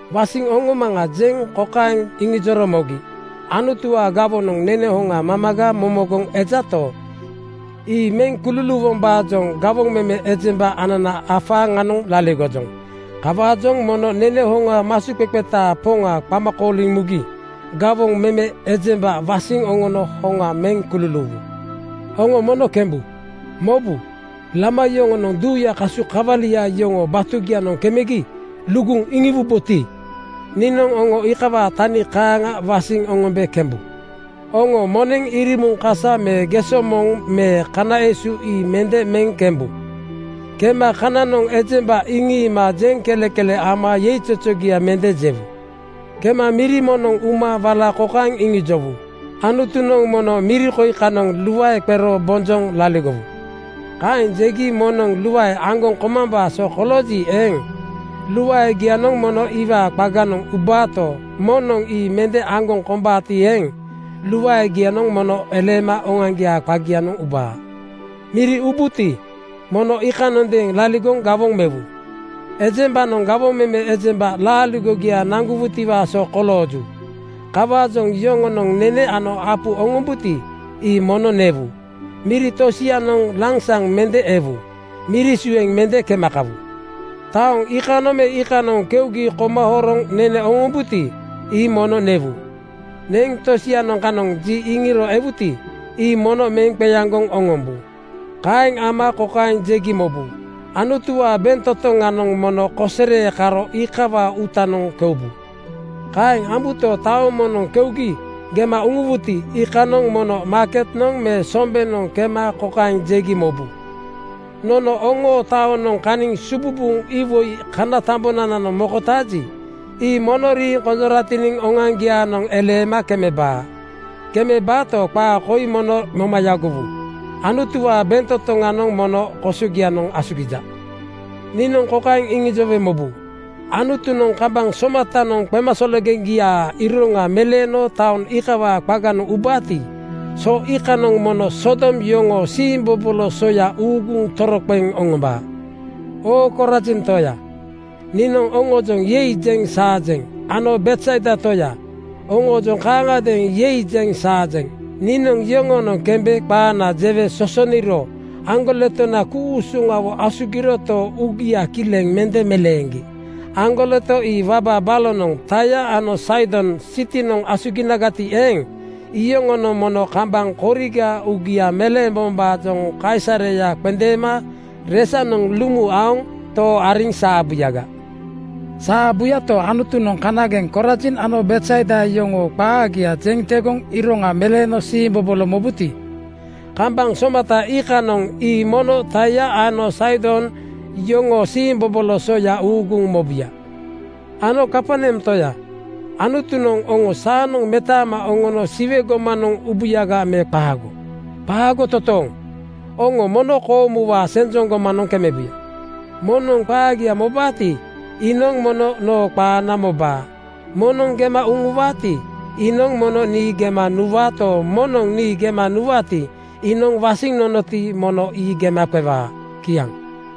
“Wasiŋ oŋomaŋa,” jeŋ kokaeŋ iŋijoro mogi, “Anutuwaa gawonoŋ nene hoŋa mamaga momogoŋ ejato, ii meŋ kululuuwombaajoŋ gawoŋ meme ejemba anana afaaŋanoŋ laligojoŋ. Kawaajoŋ mono nene hoŋa masuqeqetaa Poŋa qama kooliŋ mugi gawoŋ meme ejemba wasiŋ oŋono hoŋa meŋ kululuuwu. “Oŋo mono kembu. Mobu, lama yoŋonoŋ duuyaa kasu kawalia yoŋoo batugianoŋ kemegi luguŋ iŋiwuboti, niinoŋ oŋo iikawaa tani kaaŋa wasiŋ oŋombe kembu. Oŋo moneŋ irimuŋ kasa me geso moŋ me kana esu ii mende meŋ kembu. Kema kananoŋ ejemba iŋiima jeŋkelekele ama yeizozogia mende jewu. “Kema miri moŋnoŋ uma wala kokaeŋ iŋijowu, ‘Anutunoŋ mono miri koi kanoŋ luae qero bonjoŋ laligowu.’ Kaeŋ jegi moŋnoŋ luae aŋgoŋ komambaa so kolooji eeŋ, luaegianoŋ mono iwaa qaganoŋ ubaato, moŋnoŋ ii mende aŋgoŋ kombaati eeŋ, luaegianoŋ mono eleema oŋoaŋgiaa qagianoŋ ubaa. Miri ubuti, mono iikanondeeŋ laligoŋ gawoŋ mewu. Ejembanoŋ gawoŋ meme ejemba laaligogia naŋgowutiwaa so kolooju. Kawaajoŋ yoŋonoŋ nene ano apu oŋombuti, ii mono newu. Miri tosianoŋ lansaŋ mende ewu. Miri sueŋ mende kema kawu. “Taoŋ iikanoŋ me iikanoŋ keugi koma horoŋ nene oŋombuti, ii mono newu. Neŋ tosianoŋ kanoŋ ji iŋiro ewuti, ii mono meŋ qeaŋgoŋ oŋombu. Kaeŋ ama kokaeŋ jegi mobu, ‘Anutuwaa bentotoŋanoŋ mono kosere karo iikawaa uutanoŋ keubu.’ Kaeŋ ambuto, taoŋ moŋnoŋ keugi gema uŋuwuti, iikanoŋ mono maaketnoŋ me sombenoŋ kema kokaeŋ jegi mobu, ‘Nono oŋoo taonoŋ kaniŋ sububuŋ iwoi kana tambonananoŋ mokotaaji, ii mono riiŋ konjoratiniŋ oŋoaŋgiaanoŋ eleema kemebaa. Kemebaato, qaa koi mono moma yagowu: Anutuwaa bentotoŋanoŋ mono kosogianoŋ asugija.’ Niinoŋ kokaeŋ iŋijowe mobu: Anutunoŋ kambaŋ somatanoŋ qemasologeŋgiaa iroŋa meleeno taoŋ iikawaa qaganoŋ ubaati, so iikanoŋ mono Sodom yoŋoo siimbobolo soya uuguŋ toroqeŋ oŋombaa.” “Oo Korazin toya, niinoŋ oŋoojoŋ ‘Yei!’ jeŋ saajeŋ ano Betsaida toya, oŋoojoŋ kaaŋagadeeŋ ‘Yei!’ jeŋ saajeŋ. Niinoŋ yoŋoonoŋ kembe qaana jewe sosoniro aŋgoletona ku-usuŋawo asugiroto, uugia kileŋ mende meleeŋgi. Aŋgoleto ii waba balonoŋ Taia ano Saidon sitinoŋ asuginagati eeŋ, iyoŋonoŋ mono kambaŋ koriga uugia meleembombaajoŋ kaisareya qendeema resanoŋ lumu aoŋ too ariŋ saabuyaga. “Saabuyagato, Anutunoŋ kanageŋ Korazin ano Betsaida yoŋoo qaagia jeŋ tegoŋ iroŋa meleeno siimbobolo mobuti, kambaŋ somata iikanoŋ ii mono Taia ano Saidon yoŋoo siimbobolo soya uuguŋ mobuya. Ano Kaperneam toya, Anutunoŋ oŋo saanoŋ metaama oŋono Siwe gomanoŋ ubuyaga me qaago? Qaago totooŋ! Oŋo mono koomuwaa senjoŋ gomanoŋ kemebuya. “Moŋnoŋ qaagia mobaati, iinoŋ mono noo qaana mobaa. Moŋnoŋ gema uŋuwaati, iinoŋ mono nii gema nuwaato, moŋnoŋ nii gema nuwaati, iinoŋ wasiŋ nonoti, mono ii gema qewaa.” Kiaŋ.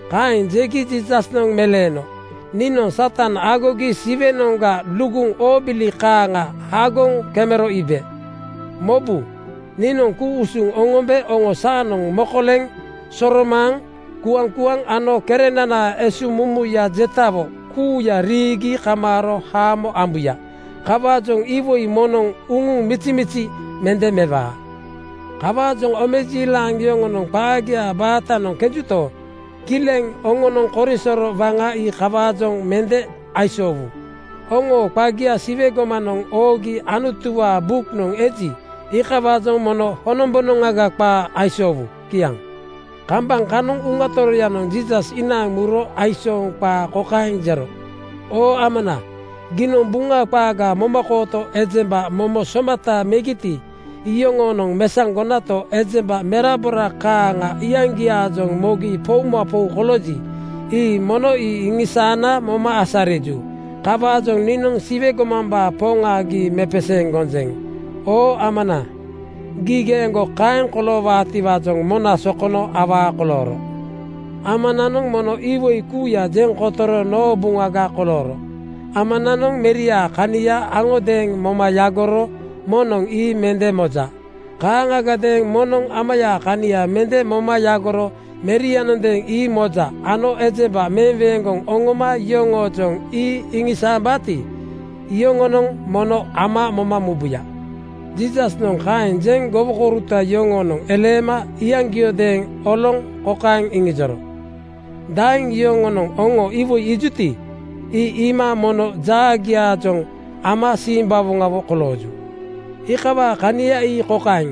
Kaeŋ jegi Jiisasnoŋ meleeno, “Niinoŋ Satan aagogi Siwenoŋga luguŋ oobili kaaŋa hagoŋ kemero iibe. Mobu, niinoŋ ku-usuŋ oŋombe oŋo saanoŋ mokoleŋ, soromaaŋ, kuaŋkuaŋ ano kerenanaa esuŋmumuya jetawo kuuya riigi kamaaro haamo ambuya. Kawaajoŋ iwoi moŋnoŋ uŋuŋ mizimizi mende mewaa. “Kawaajoŋ omejiilaŋ yoŋonoŋ qaagia baatanoŋ kenjuto, kileŋ oŋoonoŋ korisoro waŋa ii iikawaajoŋ mende aisoowu. Oŋoo qagia Siwe gomanoŋ oogi Anutuwaa buknoŋ eji, iikawaajoŋ mono honombonoŋga qaa aisoowu.” Kiaŋ. Kambaŋ kanoŋ Uŋa Toroyanoŋ Jiisas inaaŋ muro aisooŋ qaa kokaeŋ jero, “Oo Amana, giinoŋ Buŋa qaaga momakooto ejemba momo somata megiti, iyoŋoonoŋ mesaŋgonato, ejemba merabora kaaŋa iyaŋgiaajoŋ mogi poumapou kolooji, ii mono ii iŋisaana moma asariju. Kawaajoŋ niinoŋ Siwe gomambaa Poŋa gii mepeseeŋ gonjeŋ. Oo Amana, gii geeŋgo kaeŋ koloowaatiwaajoŋ mona sokono awaa kolooro. “Amananoŋ mono iwoi kuuya jeŋ kotoro noo buŋaga kolooro. Amananoŋ meriaa kania aŋodeeŋ moma yagoro moŋnoŋ ii mende moja. Kaaŋagadeeŋ moŋnoŋ Amayaa kania mende moma yagoro Merianondeeŋ ii moja ano ejemba meweeŋgoŋ oŋoma yoŋoojoŋ ii iŋisaambaati, iyoŋonoŋ mono Ama moma mubuya.” Jiisasnoŋ kaeŋ jeŋ gowokouruta yoŋoonoŋ eleema iyaŋgiodeeŋ oloŋ kokaeŋ iŋijoro, “Daeŋ yoŋonoŋ oŋo iwoi iijuti, ii iima mono jaagiaajoŋ ama simbawoŋawo kolooju. Iikawaa kania ii kokaeŋ: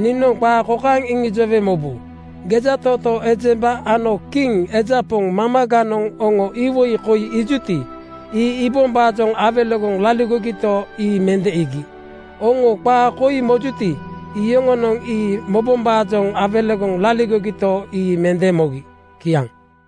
Niinoŋ qaa kokaeŋ iŋijowe mobu, Gejatootoo ejemba ano kiŋ eja poŋ mamaganoŋ oŋo iwoi koi iijuti, ii iibombaajoŋ awelegoŋ laligogito, ii mende iigi. Oŋo qaa koi mojuti, iyoŋonoŋ ii mobombaajoŋ awelegoŋ laligogito, ii mende mogi.” Kiaŋ.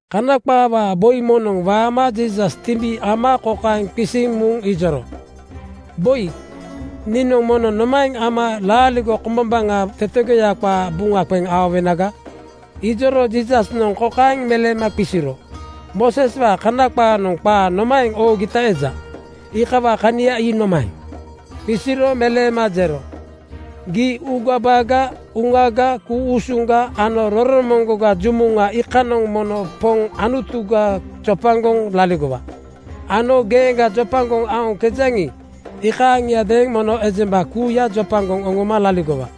Kana qaawaa boi moŋnoŋ waama Jiisas timbi ama kokaeŋ qisiŋ muŋ ijoro, “Boi, niinoŋ mono nomaeŋ ama laaligo kombombaŋa tetegoya qaa buŋa qeŋ aowenaga?” Ijoro Jiisasnoŋ kokaeŋ meleema qisiro, “Mooseswaa Kana qaanoŋ qaa nomaeŋ oogita eja? Iikawaa kania ii nomaeŋ?” Qisiro meleema jero, “‘Gii uugabaga, uŋaga, ku-usuŋga ano roromoŋgoga jumuŋa iikanoŋ mono Poŋ Anutuga jopagoŋ laligowa,’ ano ‘Geeŋga jopagoŋ aoŋkejaŋi, iikaaŋiadeeŋ mono ejemba kuuya jopagoŋ oŋoma laligowa’.”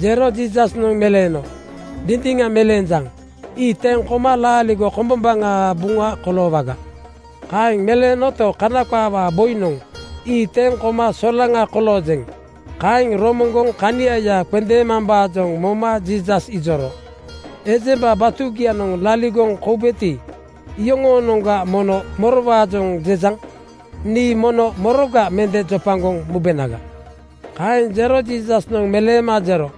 Jero Jiisasnoŋ meleeno, “Dindiŋa meleenjaŋ. Ii teŋ koma laaligo kombombaŋaa buŋa koloowaga.” Kaeŋ meleenoto, Kana qaawaa boinoŋ ‘Ii teŋ koma solaŋa koloojeŋ,’ kaeŋ romoŋgoŋ kaniaya qendeemambaajoŋ moma Jiisas ijoro, “Ejemba batugianoŋ laligoŋ koubeti, iyoŋoonoŋa mono morowaajoŋ jejaŋ? Nii mono moroga mende jopagoŋ mubenaga?” Kaeŋ jero Jiisasnoŋ meleema jero,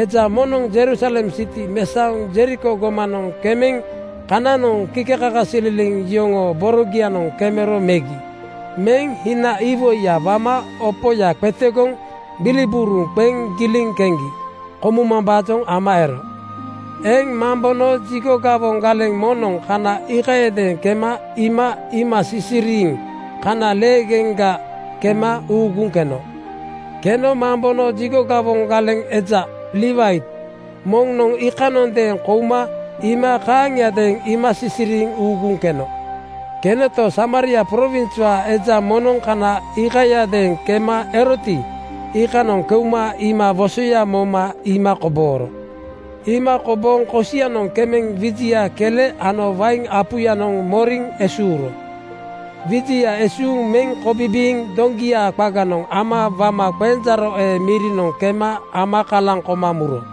“Eja moŋnoŋ Jerusalem siti mesaoŋ Jeriko gomanoŋ kemeŋ kananoŋ kikekakasililiŋ yoŋoo borogianoŋ kemero megi. Meŋ hina iwoiya wama opoya qetegoŋ gbilibuuruŋ qeŋ giliŋ keŋgi komumambaajoŋ ama ero. Eŋ mambono jigo gawoŋ galeŋ moŋnoŋ kana iikayadeeŋ kema iima iima sisiriiŋ kana leegeŋga kema uuguŋ keno. Keno mambono jigo gawoŋ eja (Liwait) moŋnoŋ iikanoŋ kouma iima kaaŋiadeeŋ iima sisiriiŋ uuguŋ keno. Kenoto, Samaria prowinswaa eja moŋnoŋ kana iikayadeeŋ kema eroti, iikanoŋ keuma iima wosoya moma iima kobooro. “Iima kobooŋ kosianoŋ kemeŋ wijia kele ano wain apuyanoŋ moriŋ esuuro. Wijia esuuŋ meŋ kobibiiŋ doŋgiya qaganoŋ ama wama qenjaaro ee mirinoŋ kema ama kalaŋ koma muro.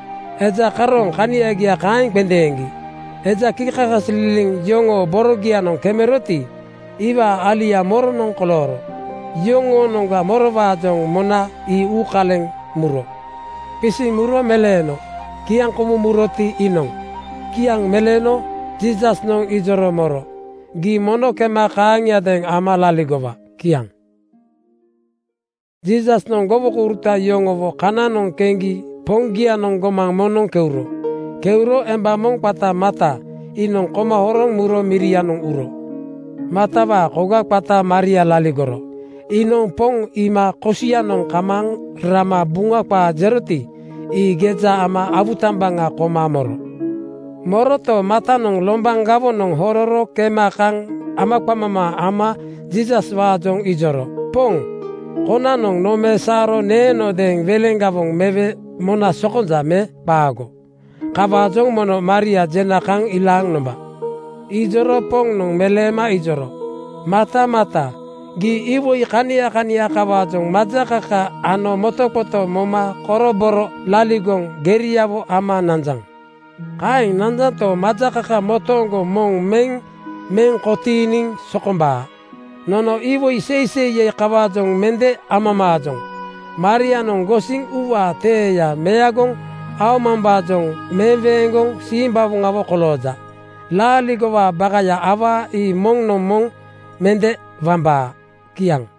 Eja karooŋ kaniagia kaeŋ qendeeŋgi. Eja kikekakasililiŋ yoŋoo borogianoŋ kemeroti, iwaa alia moronoŋ kolooro? Yoŋoonoŋga morowaajoŋ mona, ii uukaleŋ muro?” Qisiŋ muro meleeno, “Kiaŋkomuŋ muroti, iinoŋ.” Kiaŋ meleeno Jiisasnoŋ ijoro moro, “Gii mono kema kaaŋiadeeŋ ama laligowa.” Kiaŋ. Jiisasnoŋ gowokouruta yoŋowo kananoŋ keŋgi Poŋgianoŋ gomaŋ moŋnoŋ keuro. Keuro emba moŋ qata Marta iinoŋ koma horoŋ muro mirianoŋ uro. Martawaa koga qata Maria laligoro. Iinoŋ Poŋ iima kosianoŋ kamaaŋ rama Buŋa qaa jeroti, ii geja ama awutambaŋa koma moro. Moroto, Martanoŋ lombaŋ gawonoŋ hororo kema kaŋ amaqamamaa ama Jiisaswaajoŋ ijoro, “Poŋ, konanoŋ nomesaoro neenodeeŋ weleŋ gawoŋ mewe mona sokonja me qaago? Kawaajoŋ mono Maria jena kaŋ ilaaŋ nomba.” Ijoro Poŋnoŋ meleema ijoro, “Marta Marta, gii iwoi kania kania kawaajoŋ majakaka ano motoqoto moma koroboro laligoŋ geriawo ama nanjaŋ. Kaeŋ nanjanto, majakaka motooŋgo moŋ meŋ meŋ kotiiniŋ sokombaa. Nono iwoi seiseiya kawaajoŋ mende amamaajoŋ. Marianoŋ gosiŋ uuwaa teeya meagoŋ aomambaajoŋ meweeŋgoŋ simbawoŋawo kolooja. Laaligowaa bakaya awaa ii moŋnoŋ moŋ mende wambaa.” Kiaŋ.